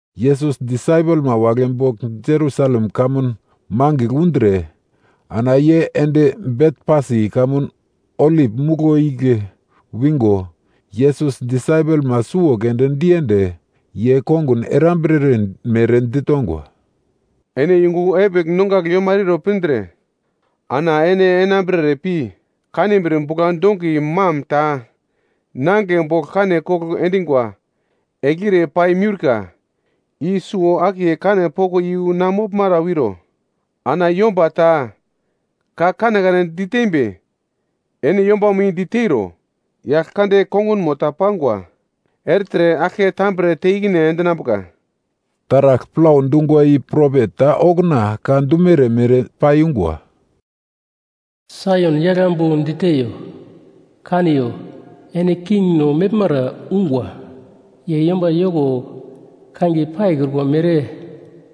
Yesus disaipelma wagle bogl Jerusalem kamun mangigl undre, ana ye ende Betfasi kamun Olip Muglo igle wingo, Yesus disaipelma suwo keunde diende, ye kongun erambirere mere ditongwa, “Ene yungu epigl nongagle yomara iro pindre ana ene enambrere pi kanbir bugla-dongi mam ta nangigle bogl kane kogl endingwa eglire pai miurka i suwo-akiye kane poko i yu na moglmara wiro. Ana yomba ta ka kanekane ditembi, ene yombamo i diteiro, “Yaglkande kongunmo ta pangwa ertre aglke tambre te ikine endinambuka.” Taragl plau dungwa i propet ta okuna ka dumere mere paiyungwa: “Saion yagl ambu diteyo, ‘Kaniyo, ene kingno meglmara ungwa. Ye yomba yoko kangiye paikrukwa mere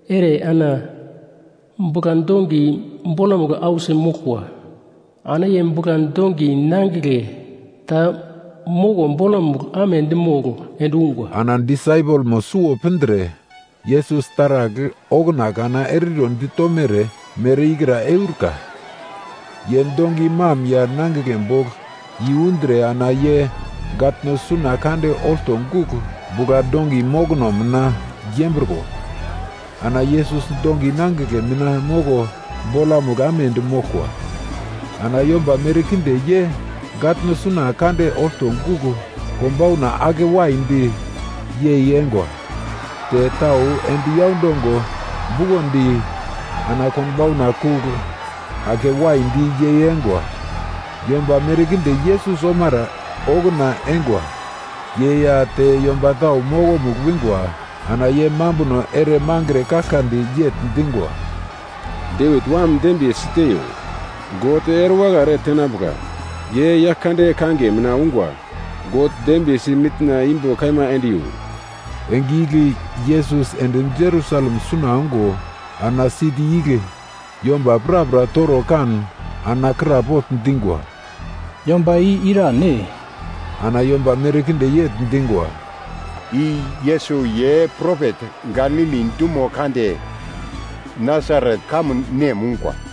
ere, ana bugla-dongi bolamugl ausi moglkwa. Ana ye bugla-dongi nangigle ta moko bolamugl amedi mogl endungwa.’” Ana disaipelmo suwo pindre, Yesus taragl okuna kana eriro ditomere mere ikra eurika. Ye dongi mam ya nangigle bogl i yundre ana ye gatno suna kande olto gugl bugla-dongi mokono mina yembriko, ana Yesus dongi nangigle mina moko bolamugl amedi moglkwa. Ana yomba merkinde ye gatno suna kande olto gugl konbauna ake waidi yei engwa. Te tau endi yaundongo bukondi, ana konbauna kugl ake waidi yei engwa. Yomba merkinde Yesus omara okuna eingwa ye ya te yomba tau mokomugl wingwa, ana ye mambuno ere mangre kaglkadi yegl dingwa, “Devit Wam dembiye siteiyo!” “God erewakai ere tenambuka, ye Yaglkande kangiye mina ungwa!” “God dembiyesi mitna imbo kaima endiyo!” Enge igle Yesus ende Jerusalem suna ongo ana siti igle yomba prapra toro kan ana krapogl dingwa, “Yomba i irane?” Ana yomba merkinde yegl dingwa, “I Yesus ye propet Galili dumo kande, Nasaret kamun nem ungwa.”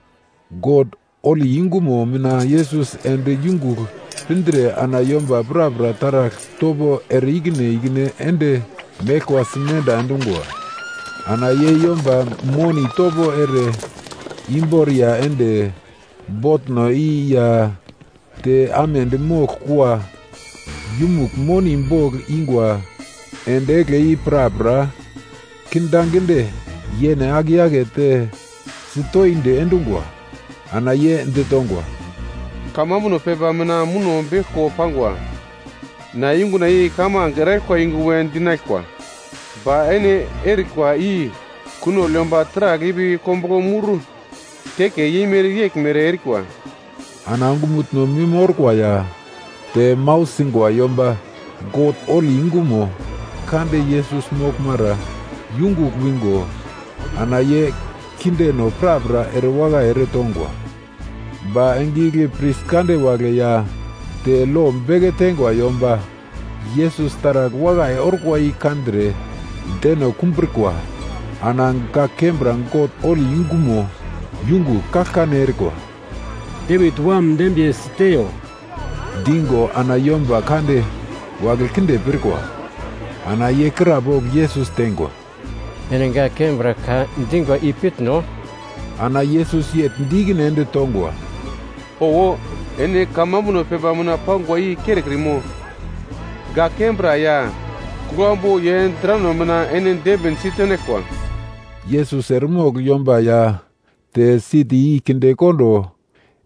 God holi yungumo mina Yesus ende yungugl pindre ana yomba prapra taragl topo ere-ikine ikine ende meglkwa simenda endungwa. Ana ye yomba moni topo ere imboriya ende botno i ya te amedi mogl kua yumugl moni bogl ingwa endi egle i prapra kindaginde yene ake yakete sitoindi endungwa. Ana ye ditongwa, “Kamambuno pepa mina muno beglko pangwa, ‘Na yunguna i kamange eraglkwa yungu we dinaglkwa.’ Ba ene erikwa i ‘kunogl yomba taragl ipi kombuglo mur teke yeimere’ yeglmere erikwa.” Ana ongumutno mim orkwa ya te mau singwa yomba God holi yungumo kande Yesus moglmara yungugl wingo, ana ye kindeno prapra erewakai eretongwa. Ba enge igle pris kande wagle ya ta lo beke teingwa yomba Yesus taragl wakai orkwa i kandre deno kumbrikwa, ana gak kembra God holi yungumo yungugl kaglkane erikwa, “Devit Wam dembiye siteiyo” dingo ana yomba kande wagle kinde pirkwa. Ana ye krapogl Yesus teingwa, “Ene gak kembra ka dingwa i pitno?” Ana Yesus yegl di ikine ende tongwa, “Owo, ene kamambuno pepa mina pangwa i kerekrimo? “‘Gak kembra ya, kuglambu ye drano mina ene dembin si tenaglkwa.’” Yesus eremogl yomba ya te siti i kindekondo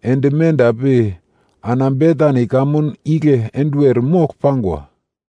ende menda pi ana Betani kamun igle enduwer mogl pangwa.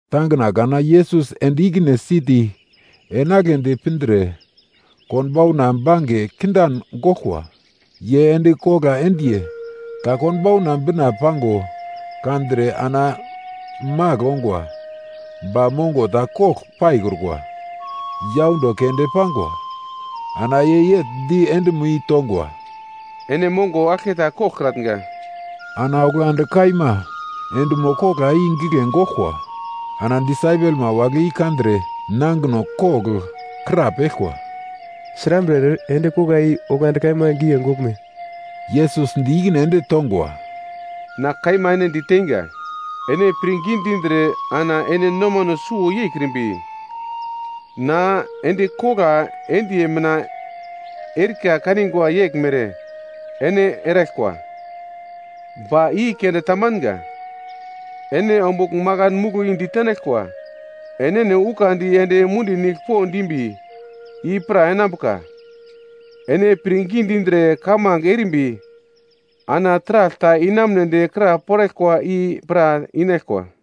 Tangina kana Yesus ende ikine siti enagledi pindre, konbauna bange kindan goglkwa. Ye endi kogla endiye ta konbauna bina pango kandre ana magl ongwa, ba mongo ta kogl paikrukwa, yaundo keunde pangwa. Ana ye yegl di endimo i tongwa, “Ene mongo aglketa koglkratnga!” Ana oglandi kaima endimo kogla i gigle goglkwa. Ana disaipelma wagle i kandre nangino kogl krapeglkwa, “Srambre ere endi kogla i oglandi kaima gigle goglme?” Yesus di ikine ende tongwa, “Na kaima ene diteinga, ene pirngi dindre ana ene nomano suwo yeikrimbi, na endi kogla endiye mina erika kanigwa yeglmere ene eraglkwa, ba i keunde tamanga. Ene ombugl makan muglo i ditenaglkwa, ‘Enene ukandi ende mundi nigl po dimbi,’ i pra enambuka. Ene pirngi dindre kamange erimbi ana taragl ta inamunedi kraporaglkwa i pra inaglkwa.”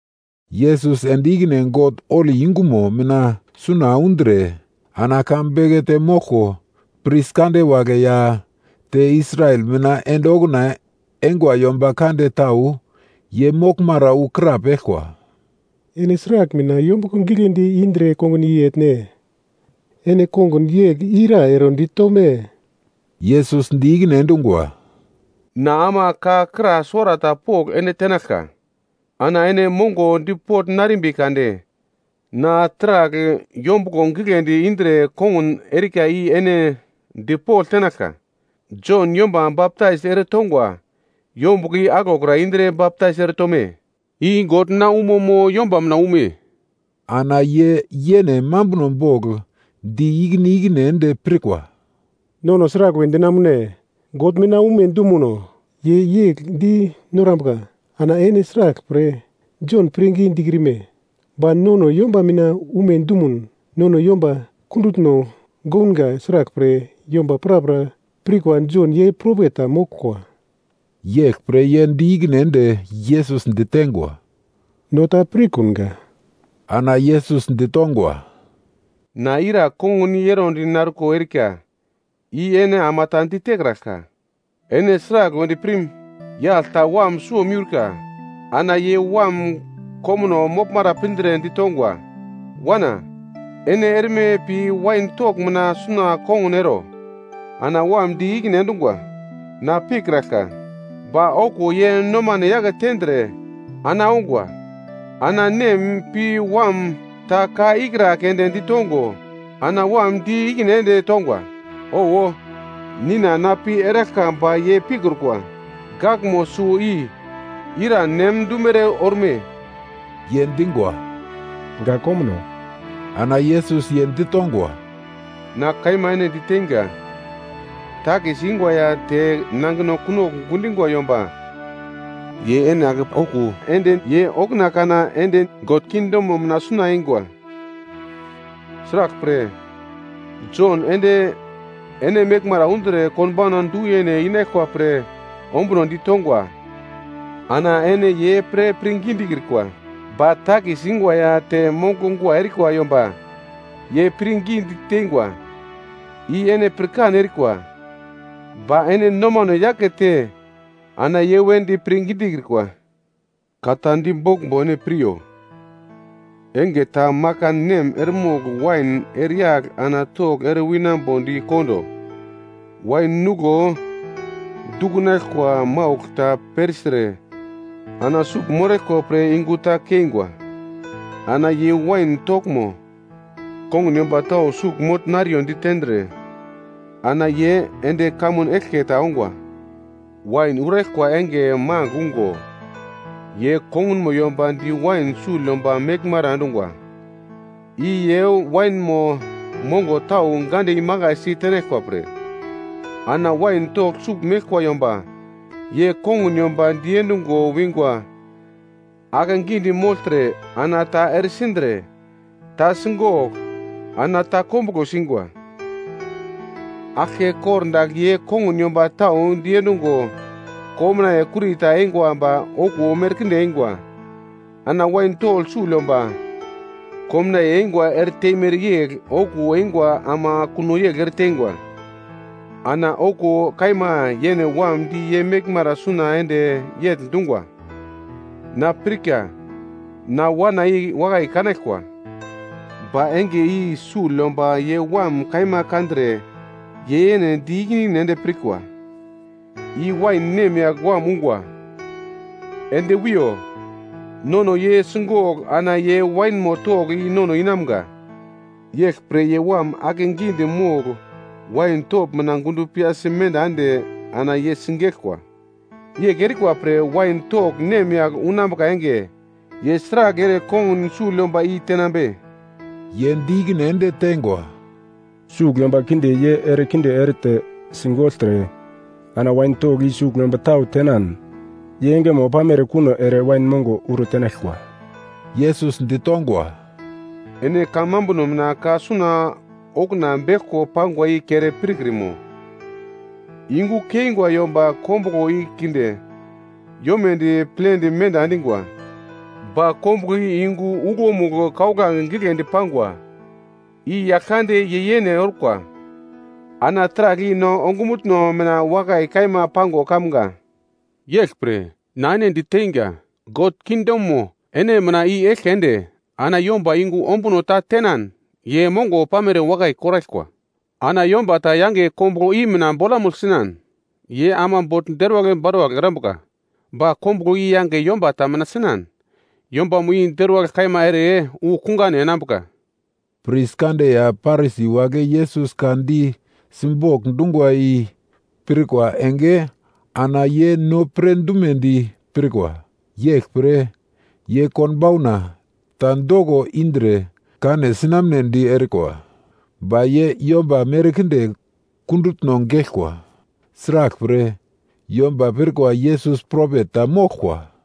Yesus ende ikine God holi yungumo mina suna undre, ana ka bekete moglko, pris kande wagle ya te Israel mina ende okuna eingwa yomba kande tau ye moglmara wu krapeglkwa, “Ene sragl mina yombuglo gigledi indre kongun i etne? Ene kongun yegl ira ero ditome?” Yesus di ikine endungwa, “Na ama ka kra suwarata pogl ene tenaglka, ana ene mongo dipogl narimbi kade, na sragl yombuglo gigledi indre kongun erika i ene dipogl tenaglka. Jon yomba baptais eretongwa yombuglo i aglokra indre baptais eretome? I God mina umo mo yomba mina ume?” Ana ye yene mambuno bogl di ikine ikine ende pirkwa, “Nono sragl we dinamune? God mina ume dumuno, ye yegl di norambuka, ana ene sraglpre Jon pirngi dikrime? Ba nono yomba mina ume dumuno, nono yomba kundutno gounga sraglpre yomba prapra pirkwa Jon ye propet ta moglkwa.” Yeglpre ye di ikine ende Yesus ditengwa, “No ta pirkunga.” Ana Yesus ditongwa, “Na ira kongun i erondi narko erika i ene ama ta ditekraglka. “Ene sragl wedi pirm? Yagl ta wam suwo miurka. Ana ye wam komuno moglmara pindre ditongwa, ‘Wana, ene erme pi wain togl mina suna kongun ero.’ Ana wam di ikine endungwa, ‘Na pikraglka,’ ba okuwo ye nomane yake tendre, ana ongwa. “Ana nem pi wam ta ka ikra keunde ditongo, ana wam di ikine ende tongwa, ‘Owo, Nina na pi eraglka,’ ba ye pikrukwa. “Gakmo suwo i, ira nem dumere orme?” Ye dingwa, “Gak komuno.” Ana Yesus ye ditongwa, “Na kaima ene diteinga, takis ingwa ya te nangino kunogl gundingwa yomba ye ene ake okuwo ende, ye okuna kana ende God kingdomo mina suna eingwa. Sraglpre, Jon ende ene meglmara undre konbauna du-yene inaglkwa pre ombuno ditongwa, ana ene ye pre pirngi dikrikwa. Ba takis ingwa ya te monguglo gua erikwa yomba ye pirngi diteingwa. I ene pirkan erikwa, ba ene nomano yakete ana ye wedi pirngi dikrikwa. “Ka ta diboglmbo ene piryo. Enge ta makan nem eremogl wain ereyagl ana togl ere winambodi kondo, wain nuglo dukunaglkwa maugl ta persire ana sugl moraglkwa pre yungu ta keingwa. Ana ye wain toglmo, kongun yomba tau sugl mogl nariyo ditendre ana ye ende kamun eglke ta ongwa. Wain uraglkwa enge magl ungo, ye kongunmo yomba di wain sugl yomba meglmara endungwa i ye wainmo mongo tau gande imakaisi tenaglkwa pre. “Ana wain togl sugl meglkwa yomba ye kongun yomba diendungo wingwa akegidi mogltre ana ta eresindre, ta sigogl, ana ta kombuglo singwa. Aglke kordagl ye kongun yomba tau diendungwa, komnaiye kurita eingwa ba okuwo merkinde eingwa. Ana wain togl sugl yomba komnaiye eingwa eretemere yegl okuwo eingwa ama kuno yegl ereteingwa. Ana okuwo kaima yene wam di ye meglmara suna ende yegl dungwa, ‘Na pirka na Wana i wakai kanaglkwa.’ “Ba enge i sugl yomba ye wam kaima kandre ye yene di ikine ikine ende pirkwa, ‘I wain nemyagl wam ungwa. Ende wiyo. Nono ye sigogl ana ye wainmo togl i nono inamga.’ Yeglpre ye wam akegidi mogl wain togl mina gundo piyasi menda ende, ana ye sigeglkwa. “Yegl erikwa pre wain togl nemyagl unambuka enge, ye sragl ere kongun sugl yomba i tenambe?” Ye di ikine ende teingwa, “Sugl yomba kinde ye erekinde erete, sigogltre, ana wain togl i sugl yomba tau tenan, ye engemo pamere kuno ere wain mongo uro tenaglkwa.” Yesus ditongwa, “Ene kamambuno mina ka suna okuna beglko pangwa i kere pirkrimo? “‘Yungu keingwa yomba kombuglo i kinde yomedi plendi menda endingwa, ba kombuglo i yungu uglomugl kauglange giglendi pangwa, i Yaglkande ye yene orkwa. Ana taragl i no ongumutno mina wakai kaima pango kamga.’ “Yeglpre, na ene diteinga, God kingdomo ene mina i-eglke ende, ana yomba yungu ombuno ta tenan ye mongo pamere wakai koraglkwa. Ana yomba ta yange kombuglo i mina bolamugl sinan ye ama bogl deruwagl baruwagl erambuka. Ba kombuglo i yange yomba ta mina sinan, yombamo i deruwagl kaima ere wu kungane enambuka.” Pris kande ya Parisi wagle Yesus ka di simbogl dungwa i pirkwa enge ana ye no pre dumedi pirkwa. Yeglpre ye konbauna ta doko indre kane sinamnedi erikwa. Ba ye yomba merkinde kundutno geglkwa. Sraglpre, yomba pirkwa Yesus propet ta moglkwa.